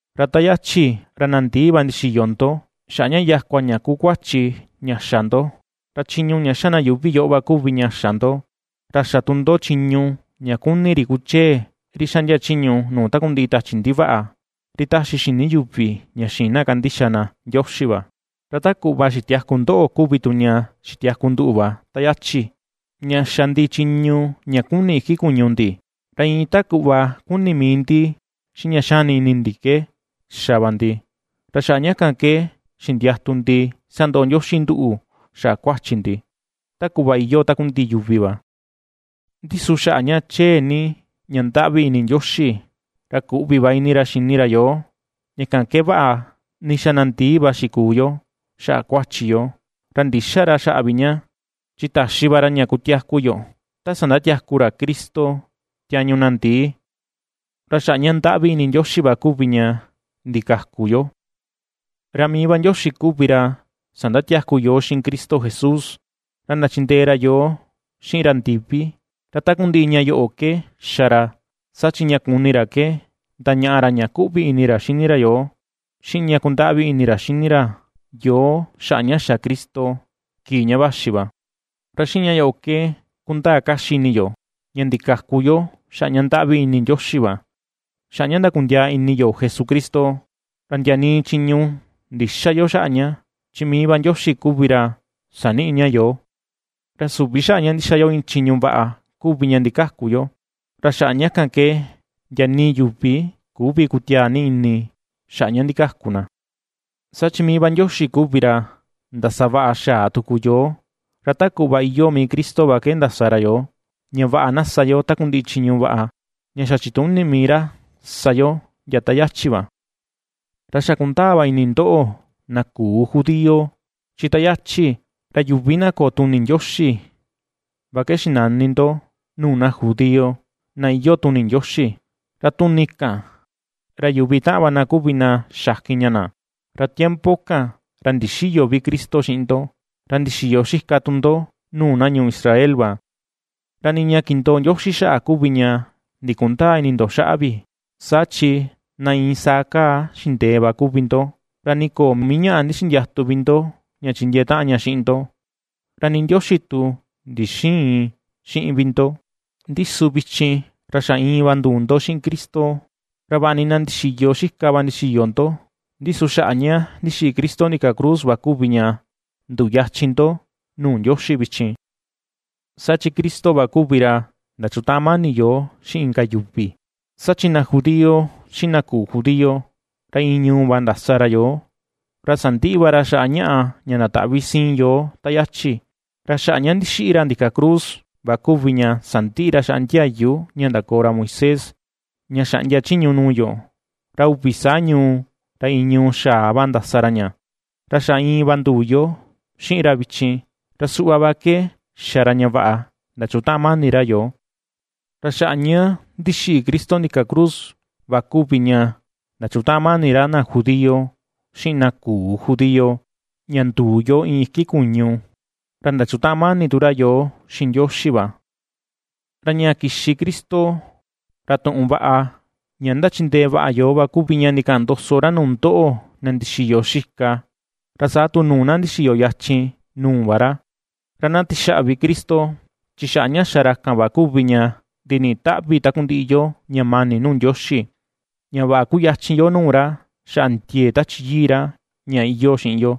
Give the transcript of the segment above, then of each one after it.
Ra ta yachi, ra na ndii va ndixiyo ndo, xaꞌa ña yakua ña kuu kuachi ña xa ndo, ra chiñu ña ^xa na yuuvi yoꞌo va kuvi ña xa ndo, ra xa tu ndo chiñu ña kuni ri kuchee, ri xaꞌndia chiñu nuu takundiꞌi tachi ndivaꞌa, ri taxi xini yuvi ña xïin na kandixa na Ndioxi va. Ra ta kuꞌva xitiaku ndoꞌo kuvi tu ña xitiaku nduꞌu va ta yachi, ña xa ndi chiñu ña kuni iki kuñu ndi, ra iin ta kuꞌva kuni mii ndi xiꞌin ña xani ini ndi ke xa va ndi, ra xaꞌa ña kan ke xindiatu ndi sandoꞌo Ndioxi nduꞌu xaꞌa kuachi ndi, ta kuꞌva iyoo takundiꞌi yuvi va. Ndi su xaꞌa ña chee ni ña ndaꞌvi ini Ndioxi, ra kuꞌvi va ini ra xini ra yoo, ña kan ke vaꞌa ni xa na ndii va xikuu yo xaꞌa kuachi yo, ra ndïxa ra xaꞌa vi ña, chi taxi va ra ña kutiaku yo ta sandatiaku ra Cristo tiañu na ndii. Ra xaꞌa ña ndaꞌvi ini Ndioxi va kuvi ña ndikaku yo. Ra mii va Ndioxi kuvi ra sandatiaku yoo xiꞌin Cristo Jesús, ra ndachindee ra yoo xiꞌin ra ndivi. Ra takundiꞌi ña yoꞌo ke xa ra, saa chi ña kuni ra ke ndañaꞌa ra ña ^kuꞌvi ini ra xini ra yoo, xiꞌin ña ^kundaꞌvi ni ini ra ^xini ra yoo xaꞌa ña xa Cristo, kii ña vaxi va. Ra xiꞌin ña yoꞌo ke kundaa kaxi ini yo, ña ndikaku yo xaꞌa ña ndaꞌvi ni ini Ndioxi va, xaꞌa ña ndakundiaa ini yo Jesucristo. Ra ndia nii chiñu ndïxa yo xaꞌa ña, chi mii va Ndioxi kuvi ra saniꞌi ña yoo. Ra süvi xaꞌa ña ndixa yo iin chiñu vaꞌa kuvi ña ndikaku yo. Ra xaꞌa ña kan ke ndia nii yuvi küvi kutiaa ni ini xaꞌa ña ndikaku na. Saa chi mii va Ndioxi kuvi ra ndasavaꞌa xaa tuku yoo, ra ta kuꞌva iyoo mii Cristo va ke ndasa ra yoo, ña vaꞌa na ^sa yo takundiꞌi chiñu vaꞌa, ña xa chituni mii ra sa yo ndia ta yachi va. Ra xa kundaa va ini ndoꞌo na küu judío, chi ta yachi, ra “yuvi na köo tuni Ndioxi” va ke xinani ndo nuu na judío, na iyoo tuni Ndioxi; ra tuni kan, ra yuvi taꞌan va na kuvi na xakin ña na. Ra tiempo kan, ra ndixïyo vi Cristo xiꞌin ndo, ra ndixiyo xika tu ndo nuu na ñuu Israel va, ra nii ña kindoo Ndioxi xaꞌa kuvi ña ndikundäa ini ndo xaꞌa vi. Saa chi na iin saa kaa xindee va kuvi ndo, ra nii köo mii ñaꞌa ndixindiatu vi ndo ña chindiee taꞌan ña xiꞌin ndo, ra nii Ndioxi tu ndixïin xiꞌin vi ndo. Ndi su vichin, ra xa iin va nduu ndo xiꞌin Cristo, ra vaꞌa ni na ndixiyo xika va ndixiyo ndo, ndi su xaꞌa ña ndixiꞌi Cristo ndika cruz va kuvi ña nduyachin ndo nuu Ndioxi vichin. Saa chi Cristo va kuvi ra ndachutaꞌan mani yoo xiꞌin inka yuvi. Saa chi na judío xiꞌin na küu judío, ra iin ñuu va ndasa ra yoo, ra sandiꞌi va ra xaꞌa ñaꞌa ña ndataꞌvi siin yoo ta yachi. Ra xaꞌa ña ndixiꞌi ra ndika cruz va kuvi ña sandiꞌi ra xaꞌa ndiayu ña ndakoo ra Moisés, ña xaꞌndia chiñu nuu yo, ra uvi saa ñuu, ra iin ñuu xaa va ndasa ra ña, ra xa iin va nduu yo xiꞌin ra vichin, ra suꞌva va ke xa ra ña vaꞌa ndachukutaꞌan mani ra yoo. Ra xaꞌa ña ndixiꞌi Cristo ndika cruz va kuvi ña ndachutaꞌan mani ra na judío xiꞌin na küu judío, ña nduu yo iin iki kuñu, ra ndachutaꞌan mani tu ra yoo xiꞌin Ndioxi va. Ra ña kixi Cristo, ra tuꞌun vaꞌa ña ndachindee vaꞌa yoo va kuvi ña ndikaꞌan ndoso ra nuu ndoꞌo na ndixiyo xika, ra saa tu nuu na ndixiyo yachin nuu va ra. Ra na tixaꞌvi Cristo, chi xaꞌa ña xa ra kan va kuvi ña ndiniꞌi taꞌvi takundiꞌi yo ña mani nuu Ndioxi, ña vaꞌa kuyachin yo nuu ra xaꞌa ndiee Tachi Yii ra ña iyoo xiꞌin yo.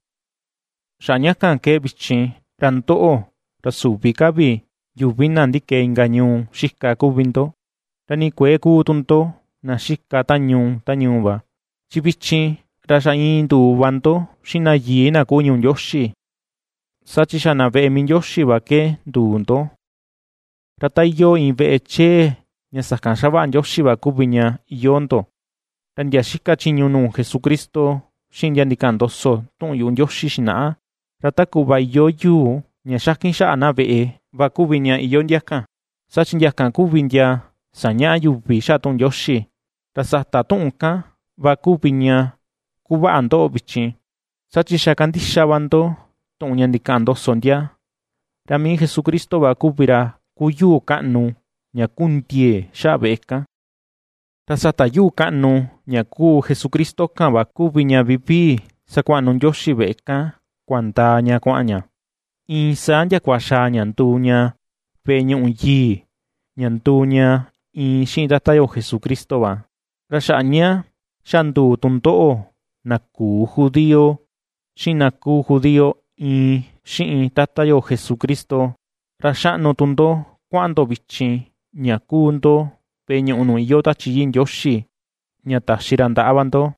Xaꞌa ña kan ke vichin, ra ndoꞌo, ra süvi ka vi yuvi na ndikee inka ñuu xika kuvi ndo, ra nii kuëe kuu tu ndo na xika ta ñuu ta ñuu va, chi vichin, ra xa iin nduu va ndo xiꞌin na yii na kuu ñuu Ndioxi, saa chi xa na veꞌe mii Ndioxi va ke nduu ndo. Ra ta iyoo iin veꞌe chee ña sakan ^xavaꞌa Ndioxi va kuvi ña iyoo ndo; ra ndia xika chiñu nuu Jesucristo, xiꞌin ndia ndikaꞌan ndoso tuꞌun yuꞌu Ndioxi xinaꞌa, ra ta kuꞌva iyoo yuu ña xakin xaꞌa na veꞌe va kuvi ña iyoo ndia kan, saa chi ndia kan kuvi ndia sañaꞌa yuvi xaꞌa tuꞌun Ndioxi, ra sata tuꞌun kan va kuvi ña ^kuvaꞌa ndoꞌo vichin, saa chi xa ^kandixa va ndo tuꞌun ña ndikaꞌan ndoso ndia; ra mii Jesucristo va kuvi ra kuu yuu kaꞌnu ña kuu ndiee xaꞌa veꞌe kan. Ra sata yuu kaꞌnu ña kuu Jesucristo kan va kuvi ña vivii sakuaꞌnu Ndioxi veꞌe kan kuandaa ña kuaꞌan ña, iin saa ndiakua xaa ña nduu ña veꞌe ñuꞌu yii, ña nduu ña iin xiꞌin Tata yo Jesucristo va. Ra xaꞌa ña xa nduu tu ndoꞌo na küu judío, xiꞌin na kuu judío iin xiꞌin Tata yo Jesucristo, ra xaꞌnu tu ndo kuaꞌan ndo vichin ña ^kuu ndo veꞌe ñuꞌu nuu iyoo Tachi Yii Ndioxi ña taxi ra ndaꞌa va ndo.